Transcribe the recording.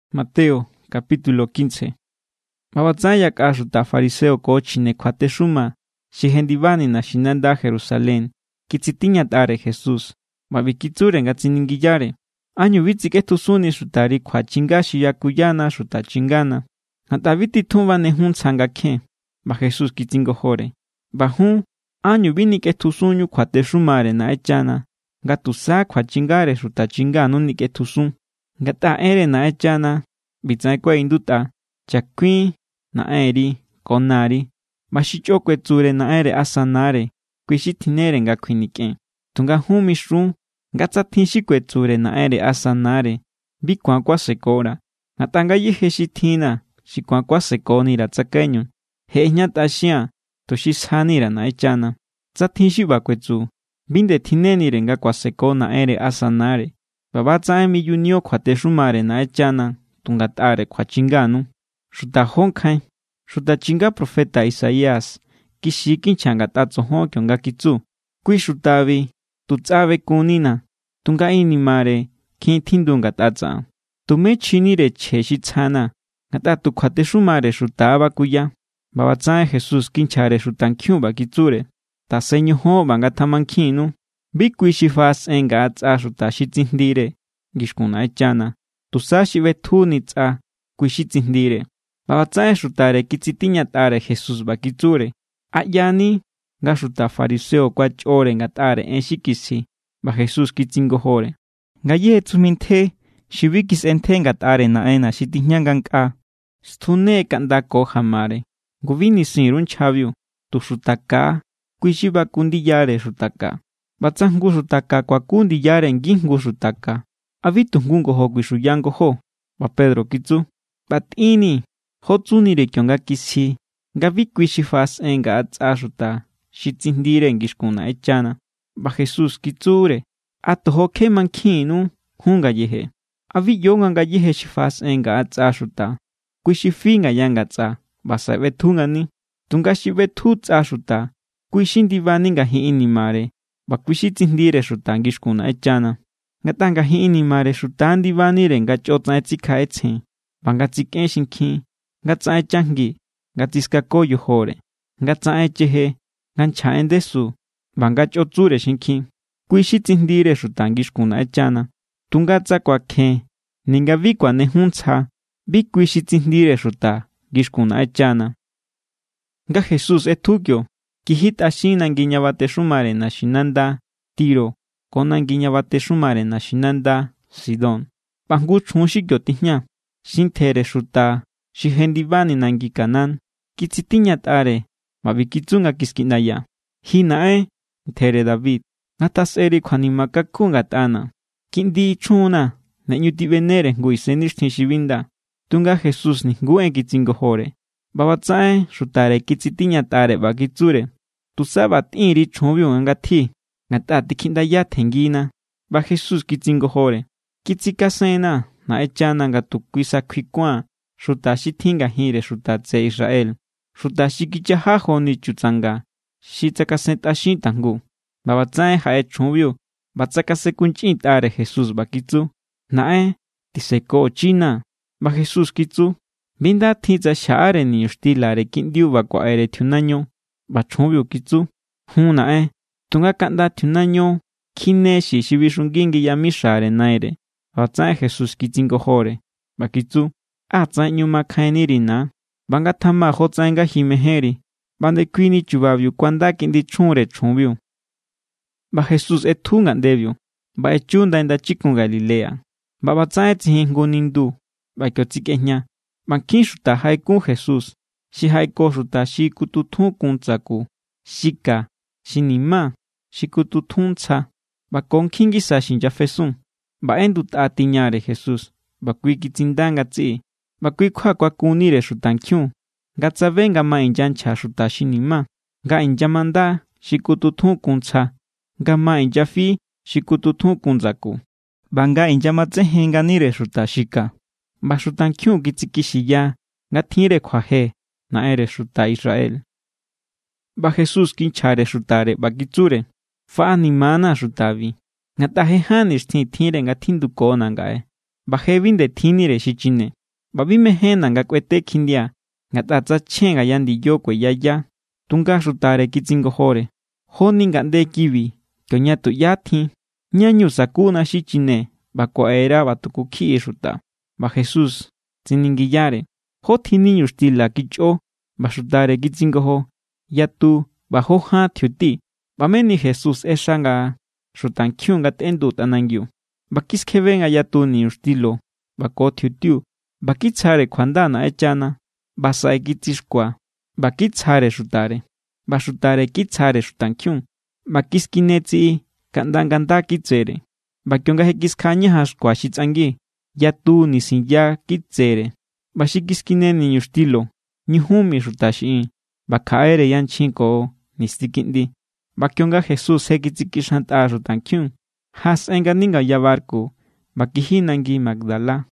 ꞌBa ꞌbatsaꞌen yakꞌa xuta fariseo ko chjine kjuatexuma xi jendibani naxinanda Jerusalén kitsitiñatꞌare Jesús, ꞌba ꞌbi kitsure nga tsiningiyare: —¿Ánñu bi tsikꞌetjusunni xutari kjuachinga xi yakuyana xuta chingana? Ngatꞌa bi titjun banejun ntsja nga kjen. ꞌBa Jesús kitsingojore: —ꞌBa jun, ¿ánñu bi nikꞌetjusunñu kjuatexumare Naꞌenchana, nga tusa kjuachingare xuta chinganu nikꞌetjusun? Ngatꞌa enre Naꞌenchana ꞌbitsaꞌen kuaꞌindutꞌa: “Chakuin naꞌenri ko nari”, ꞌba “Xi chꞌo kuetsure naꞌenre asa nare, kui xi tjinnere nga kjuinikꞌen.” Tunga jun mixun nga tsa tjin xi kuetsure naꞌenre asa nare: “Bi ku̱an kuasekora̱, ngatꞌa ngayéje xi tjinna̱ xi ku̱an kuasekonira̱ tsakaiñu, je ꞌejñatꞌaxia̱n tuxi sjani_ra̱ Naꞌenchana”, tsa tjin xi ꞌba kuetsu, bi nde tjinnenire nga kuaseko naꞌenre asa nare. ꞌBa ꞌba=tsaꞌen miyunio kjuatexumare Naꞌenchana tu ngatꞌare kjuachinganu. ¡Xuta jó nkjain! Xuta chinga profeta Isaías kixi= kinchja ngatꞌa tsojon kionga kitsu: Kui xutabi tu tsꞌa bekunnina̱, tunga inimare kjin tjindu ngatꞌa tsaꞌan. Tumé chjinire chje xi tsjana̱, ngatꞌa tu kjuatexumare xuta= bakuya. ꞌBa ꞌbatsaꞌen Jesús kinchjare xutankjiun ꞌba kitsure: —Tasen ñojon ꞌba ngatamankjinnu. Bi kui xi faꞌasꞌen ngaꞌa tsꞌa xuta xi tsijndire ngixkun Naꞌenchana, tusa xi ꞌbetjuni tsꞌa, kui= xi tsijndire. ꞌBa ꞌbatsaꞌen xutare kitsitiñatꞌare Jesús ꞌba kitsure: —¿A ꞌyani nga xuta fariseo kuachꞌore ngatꞌare en xi kisji? ꞌBa Jesús kitsingojore: —Ngayéje tsujmi ntje xi bi kisꞌentje ngatꞌare Naꞌenna̱ xi tijña ngankꞌaa, stjune kaꞌnda ko jamare. Ngu bi nisin_ru nchjabiu. Tu xuta ka= kui= xi baku ndiyare xuta ka. ꞌBa tsa jngu xuta ka kuaku ndiyare ngijngu xuta ka, ¿a bi tu jngu ngojo kuixuya ngojó? ꞌBa Pedro kitsu: —ꞌBa tꞌinnii̱ jó tsunire kionga kisji nga bi kui xi faꞌasꞌen ngaꞌa tsꞌa xuta xi tsijndire ngixkun Naꞌenchana. ꞌBa Jesús kitsure: —¿A tojo kje mankjiínnu jun ngayeje? ¿A bi ꞌyo nga ngayéje xi faꞌasꞌen ngaꞌa tsꞌa xuta, kui xi fi ngaya ngatsꞌa ꞌba saꞌe ꞌbetju ngani? Tunga xi ꞌbetju tsꞌa xuta, kui= xi ndibani ngajin inimare, ꞌba kui= xi tsijndire xuta ngixkun Naꞌenchana. Ngatꞌa ngajin inimare xuta= ndibanire nga chꞌotsaꞌen tsikjaꞌetsjen, ꞌba nga tsikꞌen xinkjin, nga tsaꞌen chajngi, nga tsiskako yojore, nga tsaꞌen cheje, nga nchja en ndesu, ꞌba nga chꞌo tsure xinkjin. Kui= xi tsijndire xuta ngixkun Naꞌenchana. Tunga tsa kuakjen ninga bi kuanejun ntsja, bi kui xi tsijndire xuta ngixkun Naꞌenchana. Nga Jesús ꞌetju kio, kijitꞌaxin nangi ña batexumare naxinanda Tiro ko nangi ña batexumare naxinanda Sidón. ꞌBa jngu chjun xi kio tijña, xi ntjere xuta xi jendibani nangi Canaán, kitsitiñatꞌare ꞌba ꞌbi kitsu nga kiskiꞌndaya: —¡Ji naꞌen, ntjere David, ngatjasꞌeri kjuanima kakun ngatꞌana̱! ¡Kiꞌndi chjunna̱ ne ꞌñu tiꞌbenere jngu isennixtjin xi bi nda! Tunga Jesús nijnguú en kitsingojore. ꞌBa ꞌbatsaꞌen xutare kitsitiñatꞌare ꞌba kitsure: —Tusa ꞌba tꞌin_ri chjunbiu nga ngatji, ngatꞌa tikjiꞌndaya tjenngina. ꞌBa Jesús kitsingojore: —Kitsikasenna̱ Naꞌenchana nga tu kui sa kjuikuan xuta xi tjin ngajinre xuta tseꞌe Israel, xuta xi kichaja joni chutsanga xi tsakasentꞌaxin tajngu. ꞌBa ꞌbatsaꞌen jaꞌe chjunbiu ꞌba tsakasenkunchꞌintꞌare Jesús ꞌba kitsu: —¡Naꞌen, tisekochina! ꞌBa Jesús kitsu: —Bi nda tjin tsa xjaꞌare niñuxtilare kiꞌndiu ꞌba kuaꞌere tjiunaño. ꞌBa chjunbiu kitsu: —Jun naꞌen, tunga kaꞌnda tjiunaño kjine xi̱ xi bixungi ngi yamixare naire. ꞌBa ꞌbatsaꞌen Jesús kitsingojore ꞌba kitsu: —¡Á tsaꞌen ꞌñu makjainniri, na! ꞌBa ngatjama jotsaꞌen nga ji mejénri. ꞌBa ndekuini chubabiu kuanda kiꞌndi chjunre chjunbiu. ꞌBa Jesús ꞌetju ngaꞌndebiu ꞌba echu ndai ndachikun Galilea, ꞌba ꞌbatsaꞌen tsijin jngu nindu ꞌba kio tsikꞌejña. ꞌBa nkjin xuta jaꞌekun Jesús xi jaꞌeko xuta xi kututjun kun ndsaku, xi ka, xi ni̱má, xi kututjun ntsja, ꞌba ko nkjin ngisa xi inyafesun. ꞌBa ꞌendutꞌa tiñare Jesús, ꞌba kui kitsinda ngatsiꞌi. ꞌBa kui= kjua kuakunnire xutankjiun, nga tsabe nga ma inyanchja xuta xi ni̱má, nga inyamanda xi kututjun kun ntsja, nga ma inyafi xi kututjun kun ndsaku, ꞌba nga inyamatsejen nganire xuta xi ka. ꞌBa xutankjiun kitsikixiya nga tjinre kjuaje Naꞌenre xuta Israel. ꞌBa Jesús kinchjare xutare ꞌba kitsure: —Faꞌanima=na̱ xutabi, ngatꞌa je ján nixtjin tjinre nga tjindukona̱ ngaꞌe ꞌba je bi nde tjinnire xichine. ꞌBa bi mejénna̱ nga kꞌuete kjindia, ngatꞌa tsa chjen ngaya ndiyo kueyaya. Tunga xutare kitsingojore: —¿Joni ngaꞌnde kibi kioña tuꞌyá tjin, ñá=ñu sakuna xi chine ꞌba kuaꞌera ꞌba tuku kjiꞌi xuta? ꞌBa Jesús tsiningiyare: —¿Jó tjin niñuxtila kichꞌo? ꞌBa xutare kitsingojo: —Yatu ꞌba jó ján tjiuti. ꞌBa meni Jesús ꞌexa nga xutankjiun ngatꞌendu tꞌanangiu. ꞌBa kiskjebe nga yatu niñuxtilo ꞌba ko tjiutiu, ꞌba kitsjare kjuanda Naꞌenchana, ꞌba saꞌe kitsixkua ꞌba kitsjare xutare, ꞌba xutare kitsjare xutankjiun. ꞌBa kiskine tsiꞌi kaꞌnda nga̱ nda kitsere. ꞌBa kionga je kiskjaꞌañajan xkua xi tsꞌangi, yatu nisinya kitsere. ꞌBa xi kiskine niñuxtilo ñujun mi xuta xiꞌin, ꞌba kjaꞌere yanchjin ko nisti kiꞌndi. ꞌBa kionga Jesús je kitsikixantꞌa xutankjiun, jaꞌasꞌen ngani ngaya barku ꞌba kiji nangi Magdala.